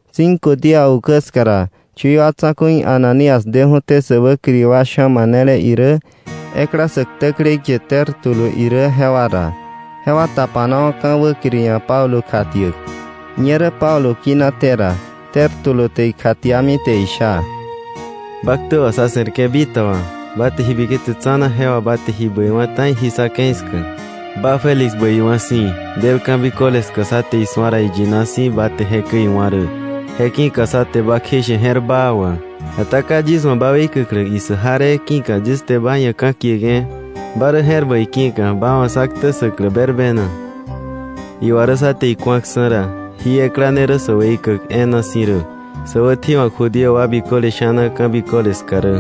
Cinco día ukä ska ra, chui wa tsa̱ku̱i Ananías deju̱té sä wäkiri wa sha̱ manele irä, ekla sä ktäklei kie Tértulo irä jewa ra. Jewa tapanawa̱ ka̱ wäkiri ia̱ Pablo kjatiäk. Ñerä Pablo kinaté ra, Tértulo te ikjatiami te isha: —Ba ktä wà sa̱ se̱rke̱ bitaba, ba te ji biketse tsa̱na, je wà ba te ji bäiwa̱ ta̱i jí sa̱ ke̱i ska, ba Félix bäiwa̱ si̱, del ka̱ biköle ska, sá te isu̱a ra iyina irä, je ki̱ka sá te ba kjeishe je̱r baa wà. Ata ka yis wa̱ ba weikäklä issäk jaree ki̱ka yis te ba ia̱ ka̱kieke̱ ba rä je̱r bäi ki̱ka ba wa̱ sá ktä ssäklä berbena. Iwa rä sá te iku̱aksa̱ ra jí ekla ne rä sä weikäk e̱e̱na si̱ rä, sä wätji̱wa̱k Judío wa biköle sha̱na ka̱ biköle ska rä.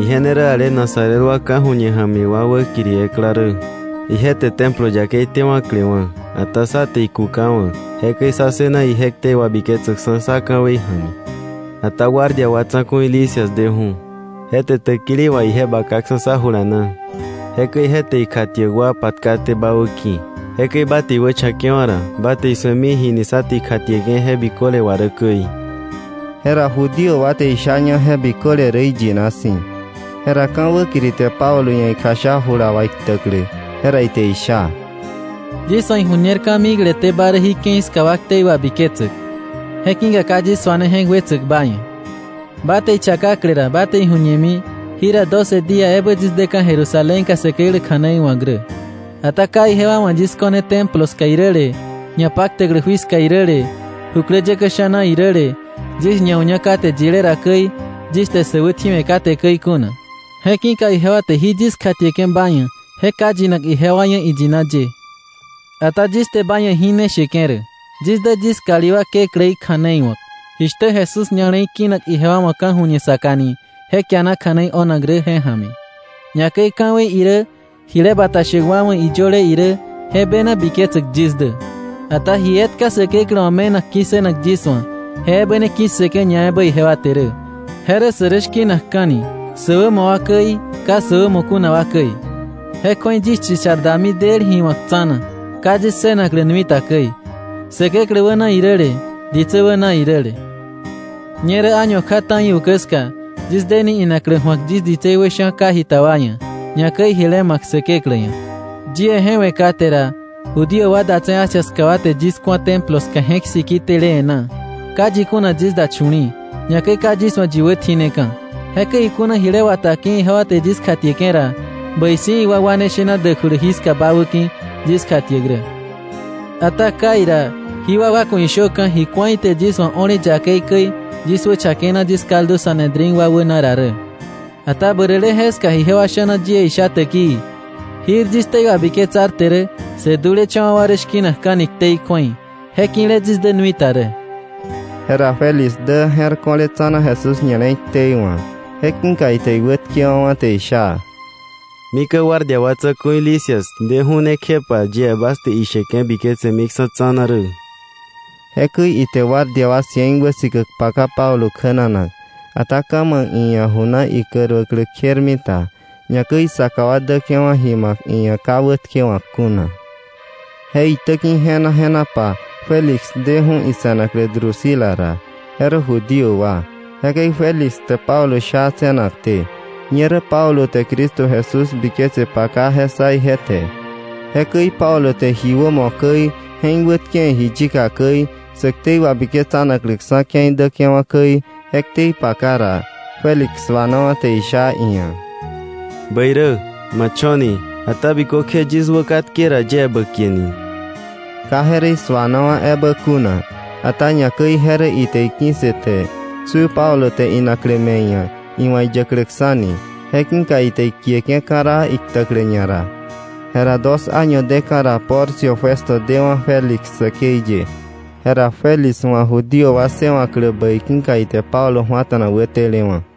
Ije ne rä ale Nazaret wa ka̱ju̱ñe ja̱mi wa wäkiri ekla rä. Ije te Templo yakei tewa̱klewa̱, ata sá te ikukawa̱, jekäi sá ssëna ije ktei wabiketsäkksa̱ sá ka̱wei ja̱mi. Ata guardia wa tsa̱ku̱i Lisias deju̱, je te täkili wà ije bakaksa̱ sá jula na. Jekäi je te ikjatiäk wa patkaté ba wäki̱, jekäi ba te iwächakewa̱ ra, ba te isu̱emi ji ni sá te ikjatieke̱ je biköle wà rä käi. Jera Judío wa te ishaña je biköle rä iyina si̱. Jera ka̱ wäkiri te Pablo ia̱ ikjasha jula wà iktäklä. Jera ite isha: —Yis wa̱ iju̱ñer ka̱mikleté ba rä jí ke̱i ska wa ktei wabiketsäk, je ki̱ka ka yis suane je̱k wetsäk ba ia̱. Ba te ichakakle ra ba te iju̱ñemi, jira doce día ebä yis deka̱ Jerusalénka Säkeklä kja̱nei wa̱k rä. Ata ka ijewa wa̱ yis ko̱ne Templo ska iräle, ñapaktäklä jui ska iräle, jukläyäkä sha̱na iräle, yis ñau̱ña kate yilé ra käi, yis te sä wätji̱we̱ kate käi kuna. Je ki̱ka ijewa te jí yis kjatieke̱ ba ia̱ je ka yinak ijewa ia̱ iyina ye. Ata yis te ba ia̱ jí ne sheke̱ rä: yis dä yis kalí wa Kekläí kja̱nei wa̱k, jishtä Jesús ña̱le̱i kinak ijewa wa̱ ka̱ju̱ñe saka ni je kiana kja̱nei o̱nak rä je ja̱mi. Ñakäi ka̱wei irä jile bata shäk wa wa̱ iyöle irä je bena biketsäk yis dä. Ata ji etka Säkeklä wa̱ me̱nak ki̱ssënak yis wa̱, je ebä ne ki̱ssëke̱ ñaebä ijewa te rä; je rä sä rä shki̱nakka̱ni, sä wämo wa käi, ka sä wämo kuna wa käi. Je kju̱ei yis chichar dami del ji wa̱k tsa̱na, ka yis ssënaklä nui ta käi, Säkeklä wäna iräle, ditsä wäna iräle. “Ñerä año kja ta̱i ukä ska yis deni inaklä ju̱ak yis ditsei wä sha̱ ka jita wa ia̱, ñakäi jile ma̱k Säkeklä ia̱. Yie je we̱ kate ra, Judío wa datse̱ Asia ska wa te yis ku̱a Templo ska je̱k siki tele e̱ná. Ka yi kuna yis da chu̱li̱i̱, ñakäi ka yis wa̱ yi wätjineka̱. Jekäi ikuna jile wata ki̱ ijewa te yis kjatieke̱ ra, bäi si̱ iwakwane shena däkjulu jiska bä wäki̱ yis kjatiäk rä, ata kai ra, jí wakwa ku̱ ishöka̱, ji ku̱a ite yis wa̱ o̱le yakei käi, yis wächakena yis kaldu Sanedrín wa wäna ra rä. Ata bäräle jeska ijewa sha̱na yie isha täkii: “Jir yis ktei wabiketsarte rä, sä dulecha̱wa̱ wa rä shki̱nakka̱ni ktei kju̱ei.’ Je ki̱le yis dä nui ta rä.” Jera Félix dä je̱r ko̱le tsa̱na Jesús ña̱le̱i ktei wa̱. Je ki̱ka ite iwätkewa̱wa̱, te isha: —Mika̱ guardia wa tsa̱ku̱i Lisias deju̱ ne kjepa yie bas te isheke̱ biketsemiksa̱ tsa̱na rä. Jekäi ite guardia wa cien wäsikäk paka Pablo kjänanak, ata ka̱ ma̱k iia̱ ju na ikäruäklä kjermita, ñakäi isaka wa däke̱wa̱ ji ma̱k iia̱ ka wätkewa̱k kuna. Je itäki̱ je̱na je̱napa Félix deju̱ ise̱naklä Drusila ra, je rä Judío wa. Jekäi Félix te Pablo sha tse̱nakté. Ñerä Pablo te Cristo Jesús biketse paka, je ssa ije te. Jekäi Pablo te ji wämo käi, je̱k wätkewe̱ ji yika käi, sä ktei wabiketsanakläksa̱ ke̱i däke̱wa̱ käi, je ktei paka ra, Félix suanawa̱ te isha iia̱: —Bäi rä, ma cho̱ni. Ata bikökje yis wä katke ra yie bä kieni. Ka je rä isu̱anawa̱ ebä kuna, ata ñakäi je rä ite iki̱ssëte tsu Pablo te inaklä me̱ iia̱, iwa̱ iyäkläksa̱ni. Je ki̱ka ite ikieke̱ ka̱raa iktäklä ñara. Jera dos año deka̱ ra Porcio Festo dewa̱ Félix säkei ye. Jera Félix wa̱ Judío wa ssëwa̱klä bäi ki̱ka ite Pablo ju̱ata̱na wätelewa̱.